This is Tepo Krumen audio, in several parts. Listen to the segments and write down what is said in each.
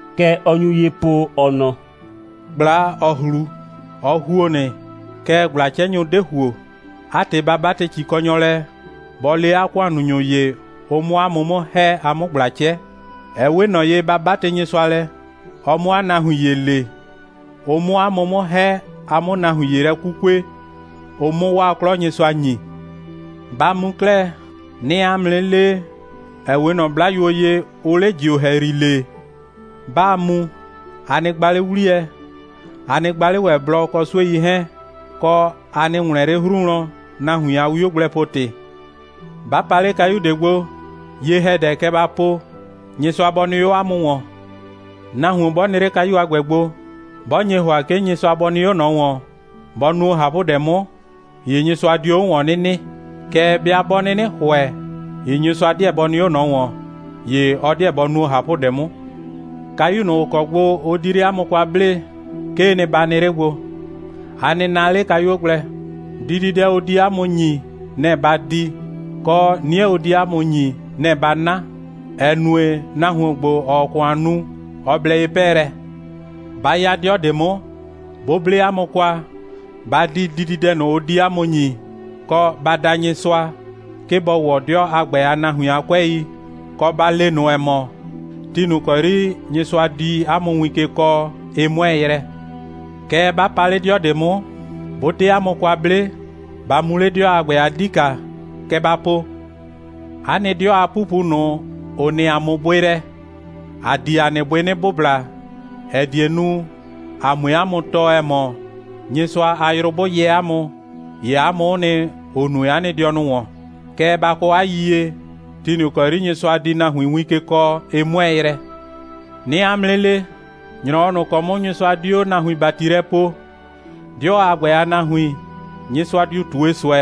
Kɛ ɔ nyu ye po, ɔ nɔ: «꞊Gbla, ‑ɔ ꞊hlu, ɔ ‑huo nɩ, kɛɛ ꞊gbla'cɛnyʋ 'de ‑huo. 'A ‑tɩ, ba 'batɩ ‑cikɔnyɔ lɛ, bɔ le 'a ‑kʋannunyʋ ‑ye, ʋ 'mʋ 'a mʋ 'mʋ ‑hɛ, a 'mʋ ꞊gbla 'cɛ. (Ɛ 'we ꞊nɔ ye, ba 'batɩ Nyɩsʋa lɛ, ɔ 'mʋ 'a nahuin ‑ye le, ʋ 'mʋ 'a mʋ 'mʋ ‑hɛ, a 'mʋ nahuin ‑ye lɛ 'kukue, ʋ 'mʋ 'waa 'klɔ Nyɩsʋa ‑nyi.) Ba mu 'klɛɛ. 'Nɩɩ 'a mʋ 'nɩ lee, ‑ɛ 'we ꞊nɔ 'blayuo ye, ʋʋ 'le ‑jio ‑hɛyri lee. 'Baa mu, a nɩ gba 'le 'wliyɛ, a nɩ gba 'le ‑wɛ blɔ, kɔ 'suei 'hɛɛn. Kɔ, a nɩ ‑wlɛn 'le 'hru wlɔn, nahuin a 'wiogblɛpo‑tɩ. 'Ba pa 'le kayu ꞊de gbo, ye‑hɛdɛ, kɛ ba po: Nyɩsʋa bɔ nɩ 'o 'a mʋ ‑wɔn. Nahuon 'bɔ nɩ 'le kayu a ‑gbɛ gbo, 'bɔ nye ‑hʋa, 'ke Nyɩsʋa bɔ nɩ 'o ꞊nɔ ‑wɔn, bɔ nuo ꞊hapʋdɛ 'mʋ, ‑ye Nyɩsʋa dio 'o ‑wɔn 'nɩ nɩ. Kɛɛ, 'bɩa 'bɔ 'nɩnɩ ‑hʋɛ, ‑ye Nyɩsʋa 'deɛ bɔ nɩ 'o ꞊nɔ ‑wɔn, ‑ye ɔ 'deɛ bɔ nuo ꞊hapʋdɛ 'mʋ. Kayu ꞊nʋ, ‑ʋ kɔ gbo ʋ di 'le 'a mʋ kwa 'blee, 'kee nɩ, ba nɩ 'le gbo. A nɩ na 'le kayuo gblɛ. Dididɛ ʋ di 'a mʋ ‑nyi, nɛ‑ ba di, kɔ, 'nie ʋ di 'a mʋ ‑nyi, nɛ‑ ba 'na, ‑ɛ nue, nahuon ‑gbo, ‑ɔɔ ‑kʋan nu, ɔ blɛ ye 'pɛɛlɛ. 'Ba 'ya 'dɩɔ ꞊de 'mʋ, 'bʋ 'ble 'a mʋ kwa, ba di dididɛ ꞊nʋ, ʋ di 'a mʋ ‑nyi, kɔ, ba da Nyɩsʋa, 'ke bɔ ‑wɔ 'dɩɔ a ‑gbɛ a nahuin a 'kʋɛi, kɔ, ba le ꞊nʋ, ‑ɛ mɔ: Ti ꞊nʋ ‑kɔ 'yri Nyɩsʋa di 'a mʋ win ke kɔɔ, ɩ 'mʋɛɛ yrɛ. Kɛɛ, 'ba pa 'le 'dɩɔ ꞊de 'mʋ, 'bʋ 'de 'a mʋ kwa 'ble, ba mu 'le 'dɩɔ a ‑gbɛ a 'dika. Kɛ ba po: 'A nɩ 'dɩɔ a 'pupu ꞊nʋ, ‑ʋ nɩ ‑a mʋ bʋɩ lɛ, ‑a di ‑a nɩ bʋɩ 'nɩ bʋbla, ‑ɛ die nu, ‑a 'mue 'a mʋ tɔɔ, ‑ɛ mɔ, Nyɩsʋa a yrʋ 'bʋ yɛ 'a mʋ, ‑ye 'a mʋ'ʋ nɩ, ‑ʋ nue 'a nɩ dɩɔnʋ ‑wɔn. Kɛɛ, ba kɔ 'a yiyie: Ti ꞊nʋ ‑kɔ 'yri Nyɩsʋa di nahuin win ke kɔɔ, ɩ 'mʋɛɛ yrɛ. 'Nɩɩ 'a mʋ 'nɩ le, ‑nyrɔwɔ ꞊nʋ ‑kɔ 'mʋ Nyɩsʋa di 'o nahuin ‑bati lɛ poo, 'dɩɔ a ‑gbɛ a nahuin, Nyɩsʋa diu ꞊tue ꞊sʋɛ,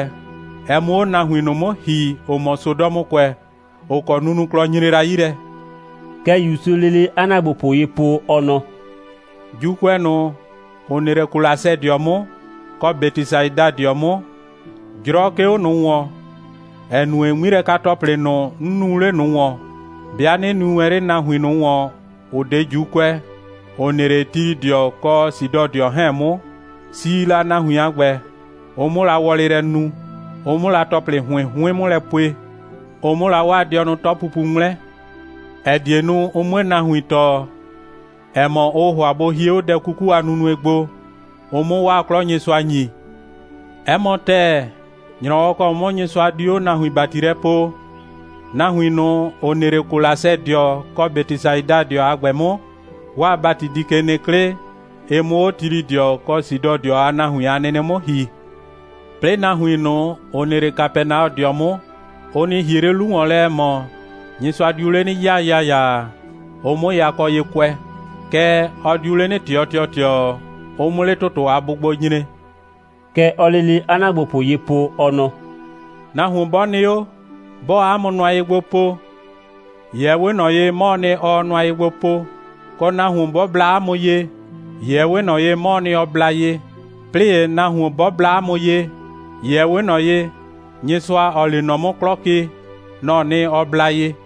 ɛ 'mʋ 'o nahuin ꞊nʋ 'mʋ ‑hi, ‑ʋ mɔ Sodɔmʋkʋɛ, ‑ʋ kɔ nunuklɔ nyre la 'yi lɛ.» (Kɛ ‑Yusuu lele 'a ‑naagbopʋ ye po, ɔ nɔ:) «‑Juukʋɛ ꞊nʋ, ‑ʋ nɩ 'le Kolasɛdɩɔ 'mʋ, kɔ Bɛtɩsaidadɩɔ 'mʋ, 'jrɔ 'ke 'o ꞊nʋ ‑wɔn, ‑ɛ nue, 'ŋmilɛka‑tɔplɩ ꞊nʋ, 'n nuu 'le ꞊nʋ ‑wɔn, 'bɩa 'nɩ nui wɛn 'le nahuin ꞊nʋ ‑wɔn, ‑ʋ 'de ‑Juukʋɛ, ‑ʋ nɩ 'le Tilɩdɩɔ kɔ Sidɔdɩɔ 'hɛɛn 'mʋ, si la, nahuin a ‑gbɛ, ʋ 'mʋ la wɔlɩ lɛ nu, ʋ 'mʋ la ‑tɔplɩ ‑hʋɩn 'hʋɩn 'mʋ lɛ pue, ʋ 'mʋ la 'waa dɩɔnʋ 'tɔpupu 'ŋmlɛ, ‑ɛ die nu, ʋ 'mue nahuin tɔɔ, ‑ɛ mɔ, ʋʋ ‑hʋa bʋ hie 'o dɛ 'kuku a nunue gbo, ʋ 'mʋ 'waa 'klɔ Nyɩsʋa ‑nyi. 'Ɛ mɔ ‑tɛɛ, ‑nyrɔwɔ ‑kɔ 'mʋ Nyɩsʋa di 'o nahuin ‑bati lɛ poo, nahuin ꞊nʋ, ‑ʋ nɩ 'le Kolasɛdɩɔ kɔ Bɛtɩsaidadɩɔ a ‑gbɛ 'mʋ, 'waa ‑bati di ke nɩ 'klɩ, ɩ 'mʋ 'o Tilɩdɩɔ kɔ Sidɔdɩɔ a nahuin a nɩnɩ 'mʋ ‑hi. 'Plɩɩ nahuin ꞊nʋ, ‑ʋ nɩ 'le Kapɛnaɔdɩɔ 'mʋ, ʋ nɩ ‑hie 'le 'lu ‑wɔn lɛ, ‑ɛ mɔ, Nyɩsʋa diu 'le 'nɩ 'yaa ‑yaayaa, ʋ 'mʋ yakɔ ye kʋɛ. Kɛɛ, ɔ diu 'le 'nɩ ꞊tɩɔ ‑tɩɔtɩɔ, ʋ 'mʋ 'le ‑tʋtʋ a bʋgbo nyre.» Kɛ ɔɔ lele 'a ‑naagbopʋ ye po, ɔ nɔ: «Nahuon 'bɔ nɩ 'o, 'bɔɔ 'a mʋ nʋa ye gbo po, ‑ye ɛ 'we ꞊nɔ ye, 'mɔɔ nɩ, ɔɔ nʋa ye gbo po, kɔ, nahuon 'bɔ bla 'a mʋ ye, ‑ye ɛ 'we ꞊nɔ ye, 'mɔɔ nɩ, ɔ bla ye. 'Plɩɩ ‑ye nahuon, 'bɔ bla 'mʋ ye, ‑ye ɛ 'we ꞊nɔ ye, Nyɩsʋa, ‑ɔɔ lee nɔ 'mʋ 'klɔ ke, nɔ‑ɔ nɩ, ɔ bla ye.»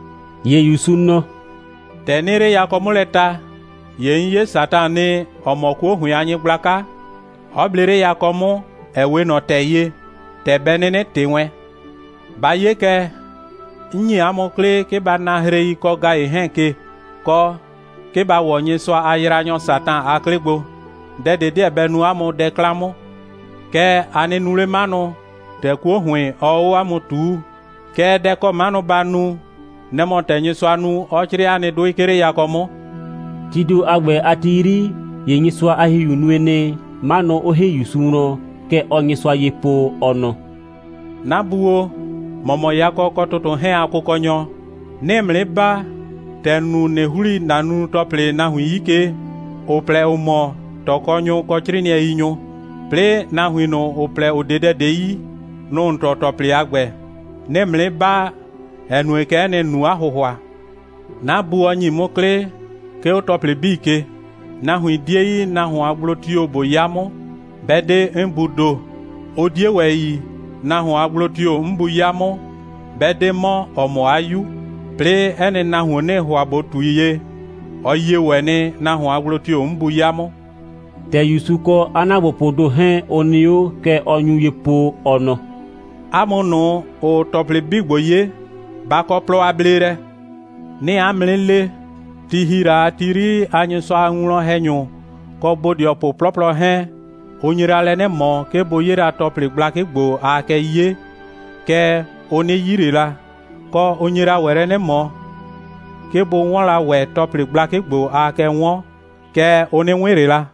‑Ye ‑Yusu nɔ: «‑Tɛ 'nɩɩ 'le yakɔ 'mʋ lɛ ta, ‑ye 'n 'ye Satan nɩ, ‑ɔ mɔ 'kuo ‑hʋɩn a nyɩgblaka, 'ɔ ble 'le yakɔ 'mʋ, ‑ɛ 'we ꞊nɔ ‑tɛ ye, ‑tɛ bɛ 'nɩnɩ ꞊tɩ wɛn. Ba 'ye kɛ, 'n ‑nyi 'a mʋ 'klɩ, 'ke ba na hrei kɔ ‑gayɩ 'hɛɛn ke, kɔ, 'ke ba ‑wɔ Nyɩsʋa a yraanyɔ Satan a 'klɩ gbo. Dɛ ꞊de 'deɛ bɛ nu 'a mʋ dɛ 'klan 'mʋ. Kɛɛ, a nɩ nu 'le 'manʋ, ‑tɛ 'kuo ‑hʋɩn, ɔɔ 'o 'a mʋ ꞊tuu. Kɛɛ, dɛ ‑kɔ 'manʋ ba nu, nɛ‑ mɔ ‑tɛ Nyɩsʋa nu, 'ɔ 'crɩɩ 'a nɩ 'dʋɩ, 'ke 'le yakɔ 'mʋ.» Tii ‑do a ‑gbɛ a ti 'yri, ‑ye Nyɩsʋa a ‑Hihiu nue nɩ, 'manʋ 'ʋ ‑hi ‑Yusu wlɔn. Kɛ ɔɔ Nyɩsʋa ye po, ɔ nɔ: «'Na Bu o, ‑mɔ mɔ yakɔ kɔ ‑tʋtʋ 'hɛɛn a Kʋkɔnyɔ. 'Nɩɩ ‑mʋ 'nɩ baa, ‑tɛ ‑n nu, ꞊nɩ ‑hli ‑na nunu‑tɔplɩ nahuin ꞊nʋ 'yi ke, ‑ʋ plɛ, ‑ʋ mɔ ꞊tɔkɔnyʋ, kɔ 'crɩɩnɩɛiyinyʋ, 'plɩɩ, nahuin ꞊nʋ, ‑ʋ plɛ, ‑ʋ 'de dɛ ꞊de yi, nʋ‑ ‑n tɔɔ ‑tɔplɩ a ‑gbɛ. 'Nɩɩ ‑mʋ 'nɩ baa, ‑ɛ nue, kɛ'ɛ nɩ, ‑n nu 'a ‑hʋhʋa. 'Na Bu, ɔ ‑nyi 'mʋ 'klɩ, 'ke 'o ‑tɔplɩ 'bii ke. Nahuin 'die yi, nahuon a gblo tio‑ ꞊bo 'ya 'mʋ, 'bɛ 'de 'n Buu ‑do. Ʋ 'die ‑wɛ yi, nahuon a gblo tio‑ 'n Bu 'ya 'mʋ, 'bɛ 'de 'mɔ, ‑ɔ mɔ 'a 'Yu. 'Plɩɩ, 'ɛ nɩ nahuon, 'nɩɩ ‑hʋa ꞊bo ꞊tui ye, ɔ yie ‑wɛ nɩ, nahuon a gblo tio‑ 'n Bu 'ya 'mʋ.» ‑Tɛ ‑Yusu kɔ 'a ‑naagbopʋʋ ‑do 'hɛɛn, ʋ nɩ 'o, kɛ ɔ nyu ye po, ɔ nɔ: «'A mʋ ꞊nʋ, ‑ʋʋ ‑tɔplɩ 'bii ‑gbo 'ye, ba kɔ plɔ a bleelɛ! 'Nɩɩ 'a mʋ 'nɩ le, ti ‑hi la a ti 'yri a Nyɩsʋa a winwlɔn‑hɛnyʋ kɔ bodɩɔpʋ 'plɔplɔ 'hɛɛn, ʋ nye la lɛ 'nɩ ꞊mɔ, 'ke bʋ 'ye la ‑tɔplɩ gblakɩ ‑gbo, aa kɛ 'ye, kɛɛ, ʋ 'nɩ 'yi ꞊le la, kɔ, ʋ nye la ‑wɛ lɛ 'nɩ ꞊mɔ, 'ke bʋ 'wɔn la ‑wɛ ‑tɔplɩ gblakɩ ‑gbo, aa kɛ 'wɔn, kɛɛ, ʋ 'nɩ 'wɩn ꞊le la.»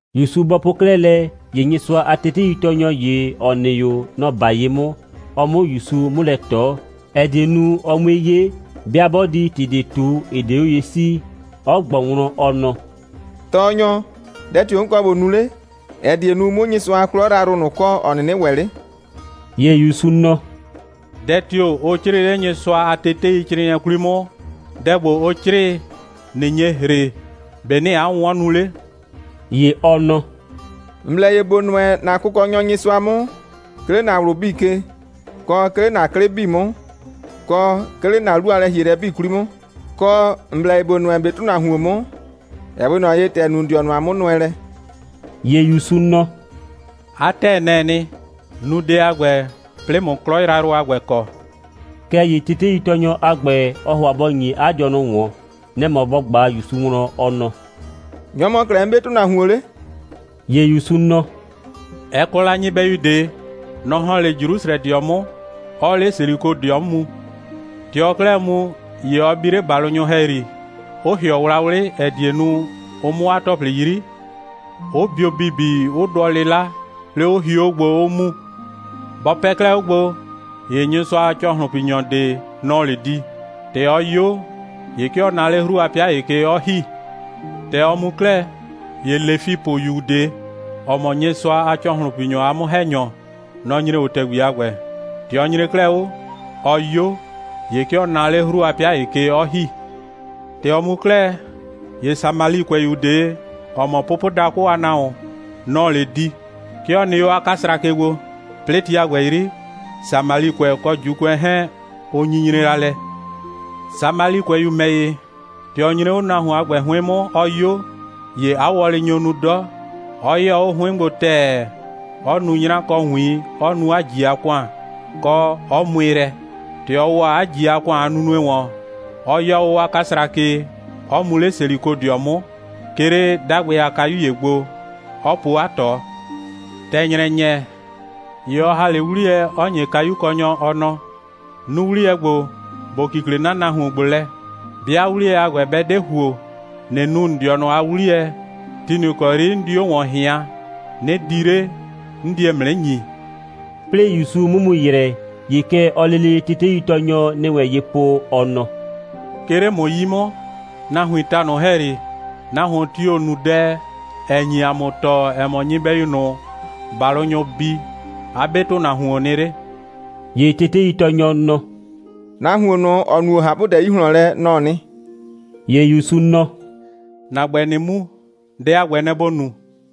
‑Yusu bɔ po 'klɛɛ lɛ, ‑ye Nyɩsʋa a teteitɔɔnyɔ ‑ye, ‑ɔ nɩ 'o, nɔ‑ 'ba ye 'mʋ, ɔ 'mʋ ‑Yusu 'mʋ lɛ ꞊tɔ, ‑ɛ die nu, ʋ 'mue 'ye, 'bɩa 'bɔ di ‑tɩ ꞊de ꞊tu, ‑ɩ 'de 'o ye 'sii, 'ɔ ꞊gbɔ wlɔn, ɔ nɔ: «Tɔɔnyɔ, dɛ tio‑ 'n kɔ ꞊bo nu 'le, ‑ɛ die nu, 'mʋ Nyɩsʋa a 'klɔ yrayrʋ ꞊nʋ kɔ, ‑ɔ 'nɩnɩ ‑wɛ 'le?» ‑Ye ‑Yusu nɔ: «Dɛ tio‑ ʋ 'crɩɩ 'le Nyɩsʋa a teteicrɩɩnɩɛ 'kwli 'mʋ? Dɛ ‑gbo, ʋ 'crɩɩ, ꞊nɩ nye ‑hre, ‑be' ‑nɩɩ 'a 'wʋnwɔn nu 'le?» ‑Ye ɔ nɔ: «‑N blɛ ye ‑bo nʋɛ ‑na Kʋkɔnyɔ Nyɩsʋa 'mʋ, 'ke 'le ‑na ꞊wlʋ 'bii ke, kɔ, 'ke 'le ‑na 'klɩ 'bii 'mʋ, kɔ, 'ke 'le ‑na 'lu a lɛ‑hielɛ 'bii 'kwli 'mʋ, kɔ, ‑n blɛ ye ‑bo nʋɛ ‑n 'be ‑tʋnahuon 'mʋ, ‑ɛ 'we ꞊nɔ ye, ‑tɛ ‑n nu ‑n dɩɔnʋ a 'mʋnʋɛlɛ.» ‑Ye ‑Yusu nɔ: «'A ‑tɛɛ, nɛ‑ɛ nɩ. Nu dɛ a ‑gbɛ, 'plɩɩ ꞊mʋ 'klɔ yrayrʋ a ‑gbɛ kɔ.» Kɛɛ ‑ye teteitɔɔnyɔ a ‑gbɛ, ɔɔ ‑hʋa bɔ ‑nyi 'a dɩɔnʋ ꞊wɔn. Nɛ‑ mɔ bɔ ꞊gba ‑Yusu wlɔn, ɔ nɔ: «Nyɔ‑ mɔ 'klɛɛ 'n 'be ‑tʋnahuon 'le?» ‑Ye ‑Yusu nɔ: «Ɛ kɔ la nyɩbɛyu ꞊de. Nɔ‑ ‑hɔn 'le Jrusrɛdɩɔ 'mʋ, 'ɔɔ 'le Selikodɩɔ 'mʋ mu. ‑Tɛ ɔɔ 'klɛɛ mu, ‑ye ɔ bi 'le ‑balʋnyʋ ‑hɛyri, 'ʋ ‑hɩɔ wlawlɩ, ‑ɛ die nu, ʋ 'mʋ 'a ‑tɔplɩ 'yri, 'ʋ bio ‑bibi, 'ʋ dʋɔ 'lɩla, 'plɩɩ, 'ʋ hio 'o gbo, 'ʋ mu. Bɔ pɛ 'klɛɛ 'o gbo, ‑ye Nyɩsʋa a ‑cɔhlʋnpinyɔ ꞊de, nɔ‑ɔ 'le di. ‑Tɛ ɔ 'yo, ‑ye 'ke ɔ na 'le 'hru a 'pɩa ‑ye ke, 'ɔ ‑hi. ‑Tɛ ɔ mu 'klɛɛ, ‑ye Lefipʋyu ꞊de, ‑ɔ mɔ Nyɩsʋa a ‑cɔhlʋnpinyɔ a 'mʋ‑hɛnyɔ, nɔ‑ nyre 'o ‑tɛgbi a ‑gbɛ. ‑Tɛ ɔ nyre 'klɛɛ 'o, ɔ 'yo, ‑ye 'ke ɔ na 'le 'hru a 'pɩa ‑ye ke, 'ɔ ‑hi. ‑Tɛ ɔ mu 'klɛɛ, ‑ye Samalikʋɛyu ꞊de, ‑ɔ mɔ pʋpʋdakʋ a nahuon, nɔ‑ɔ 'le di. ('Ke ɔ nɩ 'o 'kasra ke gbo. 'Plɩɩ, ti a ‑gbɛ 'yri, Samalikʋɛ kɔ ‑Juukʋɛ 'hɛɛn, ʋ nyinyre la lɛ.) Samalikʋɛyu ‑mɛ ‑ye, ‑tɛ ɔ nyre 'o nahuon a ‑gbɛ 'hʋɩn 'mʋ, ɔ 'yo, ‑ye 'a wɔlɩ nyo nu 'dɔ, 'ɔ 'yɩyɔ 'o 'hʋɩn 'mʋ gbo ‑tɛɛ, 'ɔ nu 'nyra kɔ ‑wiin, 'ɔ nu 'a ꞊ji a ‑kʋan, kɔ, 'ɔ mʋɩ lɛ. ‑Tɛ ɔ ‑wɔ 'a ꞊ji a ‑kʋan a nunue ‑wɔn, 'ɔ 'yɔɔ 'o 'a 'kasra ke, 'ʋ mu 'le Selikodɩɔ 'mʋ, 'ke 'le 'dagbɩ a kayu ‑ye gbo, 'ɔ po 'a ꞊tɔ. ‑Tɛ ‑nyrɛ ‑nyɛ, ‑ye ɔ ‑ha 'le 'wliyɛ, 'ɔ ‑nye kayukɔnyɔ, ɔ nɔ: Nu 'wliyɛ ‑gbo, ‑bo kikle 'na nahuon ‑gbo lɛ. 'Bɩa 'wliyɛ a ‑gbɛ, 'bɛ 'de ‑huo, ꞊nɩ nu ‑n dɩɔnʋ a 'wliyɛ, ti ꞊nʋ ‑kɔ 'yri 'n di 'o ‑wɔn ꞊hɩaan, 'nɩ di 'le, 'n die ‑mʋ 'nɩ ‑nyi.» 'Plɩɩ ‑Yusu 'mʋ mu ‑yrɛ, ‑ye kɛ ɔɔ lele teteitɔɔnyɔ ‑nɩ wɛn ye po, ɔ nɔ: «'Ke 'le ‑mʋ 'yi 'mʋ, nahuiin ta ꞊nʋ ‑hɛyri, nahuon tio‑ nu dɛ, ‑ɛ nyi ‑a mʋ tɔɔ, ‑ɛ mɔ, nyɩbɛyu ꞊nʋ, ‑balʋnyʋ bi, 'a 'be ‑tʋnahuoon nɩ 'le?» ‑Ye teteitɔɔnyɔ nɔ: «Nahuon ꞊nʋ, ‑ɔ nuo ꞊hapʋdɛ 'yi ꞊hlɔn lɛ, nɔ‑ɔ nɩ.» ‑Ye ‑Yusu nɔ: «‑Na ‑gbɛ, ꞊nɩ mu, dɛ a ‑gbɛ, nɛ‑ ‑bo nu.»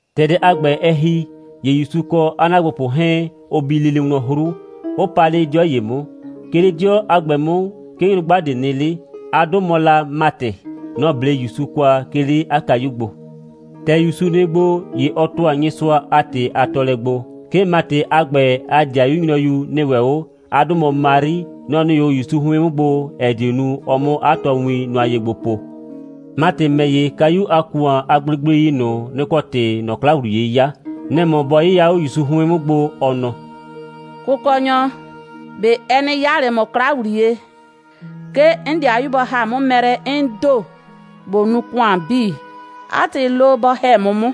‑Tɛ dɛ a ‑gbɛ, ɛ ‑hi, ‑ye ‑Yusu kɔ 'a ‑naagbopʋ 'hɛɛn, ʋ bi lele wlɔn 'hru, 'ʋ pa 'le 'dɩɔ ‑ye 'mʋ. 'Ke 'le 'dɩɔ a ‑gbɛ 'mʋ, 'ke nyrʋgba ꞊de nɩ 'le. 'A 'dʋ mɔ la Matɩ. Nɔ‑ 'ble ‑Yusu kwa, 'ke 'le 'a kayu gbo. ‑Tɛ ‑Yusu nɩ gbo, ‑ye ɔ ‑tʋa Nyɩsʋa a ‑tɩ a tɔɔlɛ gbo. 'Ke Matɩ a ‑gbɛ a ‑dɩayu nyrɔyu nɩ ‑wɛ 'o. 'A 'dʋ mɔ Mari. Nɔ‑ nɩ 'o ‑Yusu 'hʋɩn 'mʋ gbo, ‑ɛ die nu, ɔ 'mʋ 'a tɔɔwin nʋa ye gbo po. Matɩ ‑mɛ ‑ye, kayu a ‑kʋan a gblegblei ꞊nʋ, nɩ‑ kɔ ‑tɩɩ ꞊nɔ 'kla ‑wliye 'yaa. Nɛ‑ mɔ bɔ 'yɩya 'o ‑Yusu 'hʋɩn 'mʋ gbo, ɔ nɔ: «Kʋkɔnyɔ, ꞊be ɛ 'nɩ 'yaa ꞊le ‑mʋ 'kla ‑wliye, 'ke 'n ‑dɩayu bɔ ‑ha 'mʋ mɛ lɛ, 'n ‑do ꞊bo nu ‑kʋan 'bii? 'A ‑tɩ, lo, bɔ ‑hɛ 'mʋ 'mʋ.»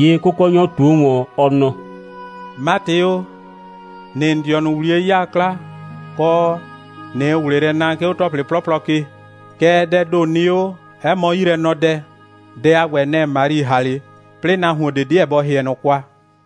‑Ye Kʋkɔnyɔ ꞊tuo ‑wɔn, ɔ nɔ: «Matɩ o, ‑nɩɩ ‑n dɩɔnʋ ‑wliye 'yaa 'kla, kɔ, ꞊nɩɩ ꞊wlɩ lɛ naa, 'ke 'o ‑tɔplɩ 'plɔplɔ ke. Kɛɛ, dɛɛ ‑do nɩ 'o, 'ɛ mɔ 'yilɛnɔdɛ. Dɛ a ‑gbɛ, nɛ‑ Mari ‑ha 'le. 'Plɩɩ nahuon ꞊de 'deɛ bɔ ‑hɩɛ ꞊nɔ kwa.»